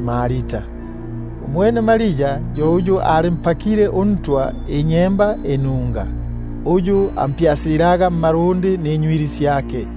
ugwamyabo. Umwene Maria ali yo uyu alimpakile uNtwa ninyemba inunga, uyu ampyasilaga mmalundi ninywili syake;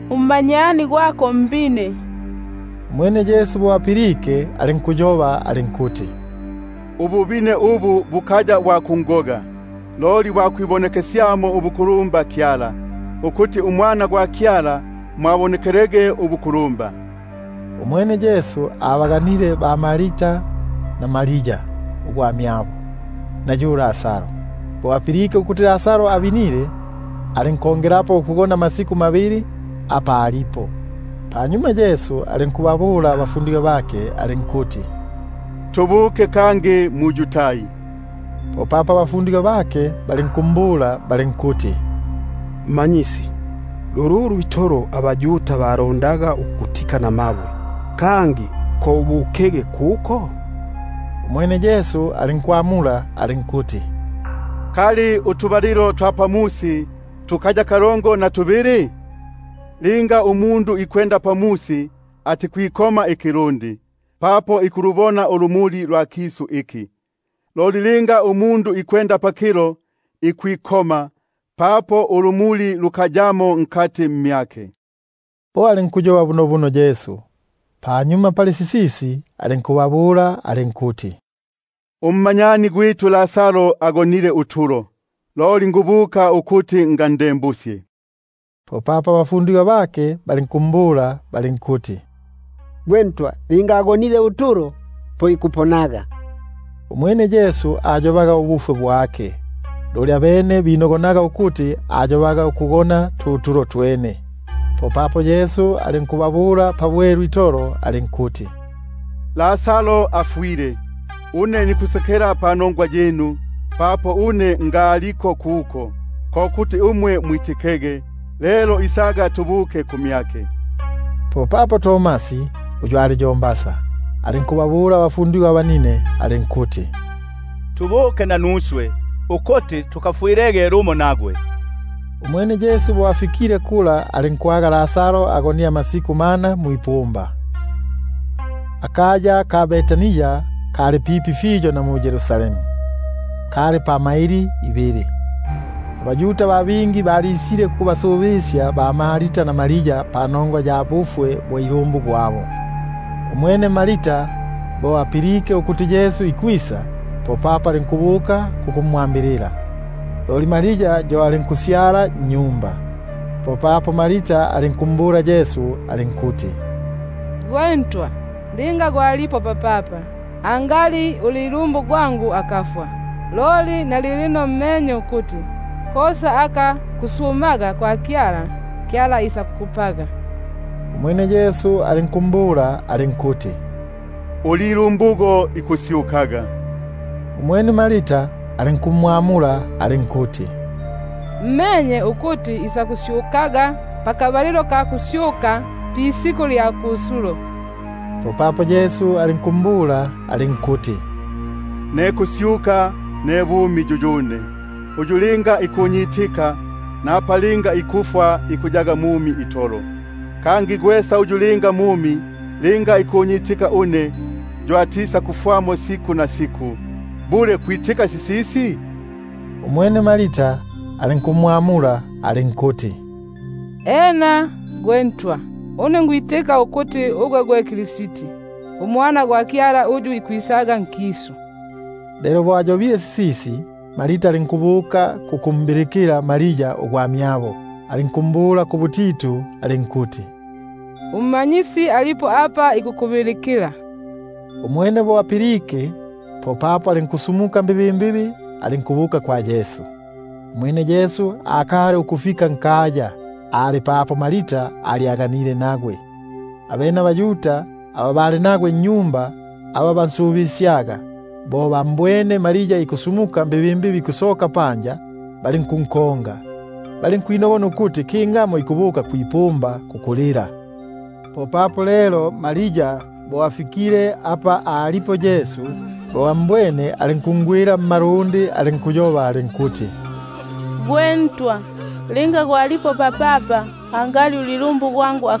ummanyani gwako mbine. Umwene Yesu bo apilike, popapo alinkuti: Ububine ubu bukaya bwa kungoga, loli bwa kwibonekesyamo ubukulumba Kyala, ukuti uMwana gwa Kyala mo abonekelege ubukulumba. Umwene Yesu abaganile ba- Marta na Maria ugwamyabo, na yu Lazaro. Napa apilike ukuti abinile, pope alinkugona amasiku mabili apa alipo. Panyuma alinkubabula abafundigwa bake alinkuti: Tubukege kangi mu-Yudai. Popapo abafundigwa bake balinkumbula balinkuti: Rabi,#Rabi, ko kuti Mmanyisi. lululu itolo abaYuda balondaga ukukutika namabwe, kangi ko ubukege kuko? Umwene Yesu alinkwamula alinkuti: Ngimba utubalilo twa musi tukaya kalongo na tubili? Linga umundu ikwenda pamusi, atikwikoma ikilundi; papo ikulubona ulumuli lwa kisu iki. Loli linga yumo ikwenda pakilo, ikwikoma, papo ulumuli lukayamo mmyake. Bo alinkuyoba bunobuno. Panyuma pali sisisi alinkubabula alinkuti: Ummanyani gwitu Lazaro agonile utulo, loli nsumwike ukuti ngandembusye. Popapo abafundigwa bake balinkumbula balinkuti: Malafyale, linga agonile utulo po ikuponaga. Umwene Yesu abalaga ubufwe bwake, loli abene binogonaga ukuti abalaga ukugona tu tulo itolo. Popapo Yesu alinkubabula pabwelu itolo alinkuti: Lazaro afwile. Une nikusekela panongwa yinu, papo ngaliko kuko, ko kuti umwe mwitikege; lelo isaga tubuke kumyake. Popapo Tomasi uyu batigi yo Didimo#Didimo ko kuti Mbasa. ingamu, alinkubabula abafundigwa abanine alinkuti: Tubuke nanuswe, ukuti tukafwilege lumo nagwe. Umwene Yesu bo afikile, alinkwaga amalilemo amasiku mana mwipumba. Akaya ka Betania kali pipi fiyo na Yeru- salemu, kaliti kali pamaili ibili. AbaYuda ba bingi balisile kukubasubisya ba-Marta na Maria panongwa ya ilumbu gwabo. Umwene Marta bo apilike ukuti Yesu ikwisa, popapo alinkubuka kukumwambilila; loli Maria yo alinku- syala nnyumba. Popapo Marta alinkumbula Yesu alinkuti: Malafyale, linga gwalipo papapa, angali ulilumbu gwangu akafwa. Loli na lilino menye ukuti, kosa aka kusuma kwa Kyala, Kyala isakukupaga. Umwene Yesu alinkumbula alinkuti: Ulilumbugo isakusyukaga. Umwene Marta alinkumwamula alinkuti: Menye ukuti isakusyukaga, bo abafwe bikusyuka pisiku lya kusulo. Popapo Yesu alinkumbula alinkuti: Ne kusyuka, ne bumi yuyune. Uyu linga ikunyi- tika, napa linga ikufwa ikuyaga mumi itolo; kangi gwesa uyu linga mumi, linga ikunyitika une, yo atisakufwamo siku nasiku. Bule kwitika sisisi? Umwene alinkumwamula alinkuti: Ena Malafyale, une nikwitika ukuti ugwe gwe Kristi, uMwana gwa Kyala uyu ikwisaga nkisu. Lelo bo ayobile sisisi, alinkubuka kukumbilikila Maria ugwamyabo, alinkumbula kubutitu alinkuti: UMmanyisi alipo ikumbilikila. Umwene bo apilike, popapo alinkusu- muka mbibimbibi, alinkubuka kumyake. Umwene Yesu akali ukufika nkaya, ali papo Marta alyaganile nagwe. Abene abaYuda aba bali nagwe nnyumba, aba bansubisyaga, bo bambwene Maria ikusumuka mbibimbibi ikusoka panja, balinkunkonga; balinkwinogona ukuti kingamo ikubuka kwi- pumba kukulila kuko. Lelo Maria bo afikile apa alipo Yesu, bo ambwene, alinkungwila mmalundi, alinkuyoba alinkuti: Malafyale, linga gwalipo papapa, angali ulilumbu gwangu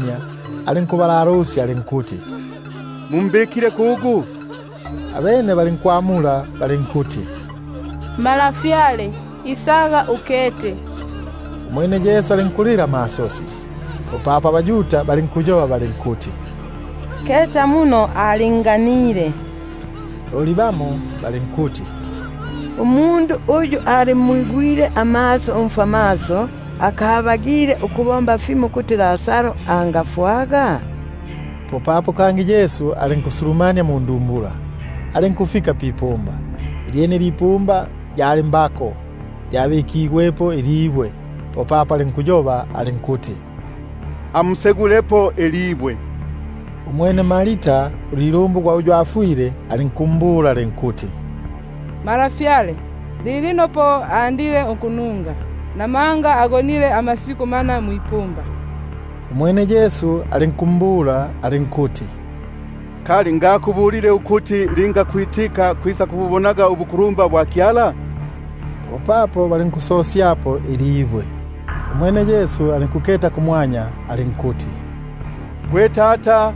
alinkusenyendeka, alinkuti: Mumbikile kugu? Abene bali- nkumwamula balinkuti: Malafyale, isaga ukete. Umwene Yesu alinkulila amasosi. Popapo abaYuda balinkuyoba bali- nkuti: Keta muno alinganile. Loli bamo balinkuti: Ngimba umundu uyu alimwigwile amaso umfwamaso, akabagile ukubomba fimo ukuti umundu uyu angafwaga? Popapo kangi Yesu alinkukalala munda, alinkufika pipumba; ilyene yali mbako, lyabikigwepo ibwe. Popapo Yesu alinkuti: Amusegulepo ilibwe. Umwene Marta ulilumbu gwa uyu afwile, alinkumbula alinkuti: Malafyale, lilino po ikununga, buno agonile amasiku mana. Umwene Yesu alinkumbula alinkuti: Kali ngakubulile ukuti linga kwitika kwisakubu- bonaga ubukulumba bwa Kyala? Popapo balinkulisegulapo ibwe. Umwene Yesu alinkwinula amaso gake kumwanya alinkuti: Gwe Tata,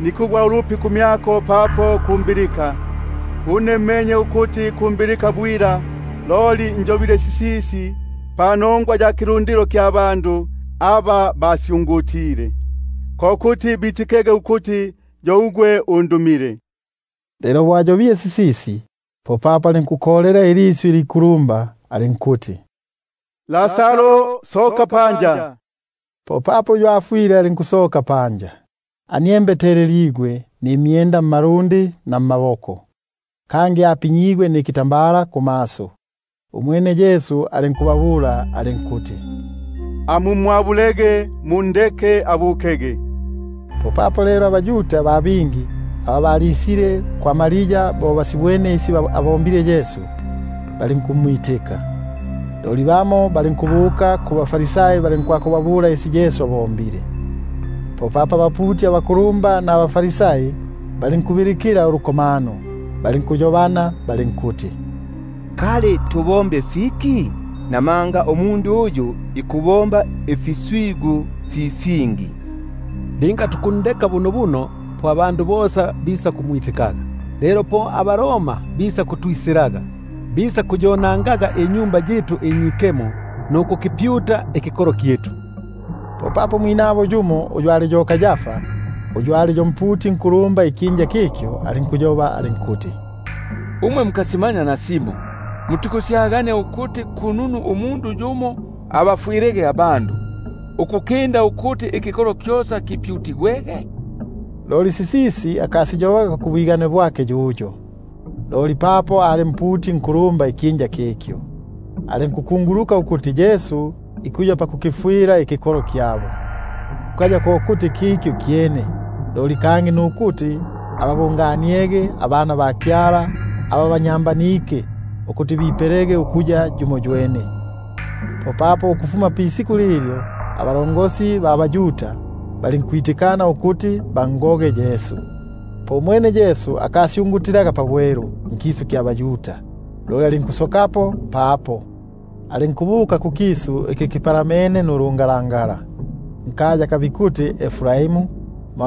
nikugwa ulupi kumyako papo umbilike. Une namenye ukuti kumbilika bwila, loli njobile sisisi panongwa ya kilundilo iki kisyungutile; ko kuti bitikege ukuti yo ugwe undumile. Lelo bo ayobile sisisi, popapo alinkukolela ilisyu ilikulumba alinkuti: Lazaro, soka. Popapo uyu afwile alinkusoka, aniembeteleligwe nimyenda mmalundi na mmaboko, kangi apinyigwe nikitambala kumaso. Umwene Yesu alinkubabula alinkuti: Amumwabulege, mundeke abukege. Lelo abaYuda ba bingi aba balisile kwa Maria, bo basibwene isi abombile, balinkumwitika. Loli bamo balinkubuka kubaFarisai, balinkwakubabula isi Yesu abombile. Popapo abaputi abakulumba nabaFarisai balinkubilikila ulukomano, balinkuyobana balinkuti: Kali nikubomba fiki? Namanga umundu uyu ikupela ifika fi fingi. Linga tukundeka bunobuno, po abandu bosa bisakumwitikaga; lelo po abaRoma bisakutwisilaga, bisakupokaga akaya kitu, nikikolo kyitu. Popapo yumo umwinabo Kayafa, uyu ali yo mputi unkulumba ikyinja kikyo, alinkuyoba alinkuti: Umwe mukasimanya nasimo, kangi mutikwinogona ukuti kununu umundu yumo abafwilege abandu, ukukinda ukuti ikikolo kyosa kipyutigwege. Loli sisisi akasiyobaga yuyo mwene, loli papo ali mputi unkulumba ikyinja kikyo, alinkukunguluka ukuti Yesu ikuya pakukifwila ikikolo kyabo, kukaya ko kuti ikukifwila ikikolo kikyo kyene, loli ko kubabungania abana ba Kyala aba banyambanike, ukuti bipelege ukuya yumoywene. Ukufuma pisiku lilyo, balinkwitikana ukuti bangoge. Popapo Yesu alinkusita ngusyungutila pabwelu nkisu kya baYuda, loli alinkusokapo papo, alinkubuka kukisu iki kipalamene ndungalangala; nkaya aka bikuti Efraimu, mo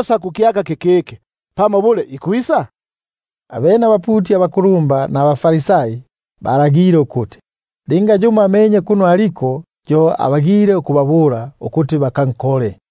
kukyaka kikiki? Abene abaputi abakulumba nabaFarisai balagile ukuti, linga yumo amenye kuno aliko, yo abagile ukubabula, ukuti bakankole.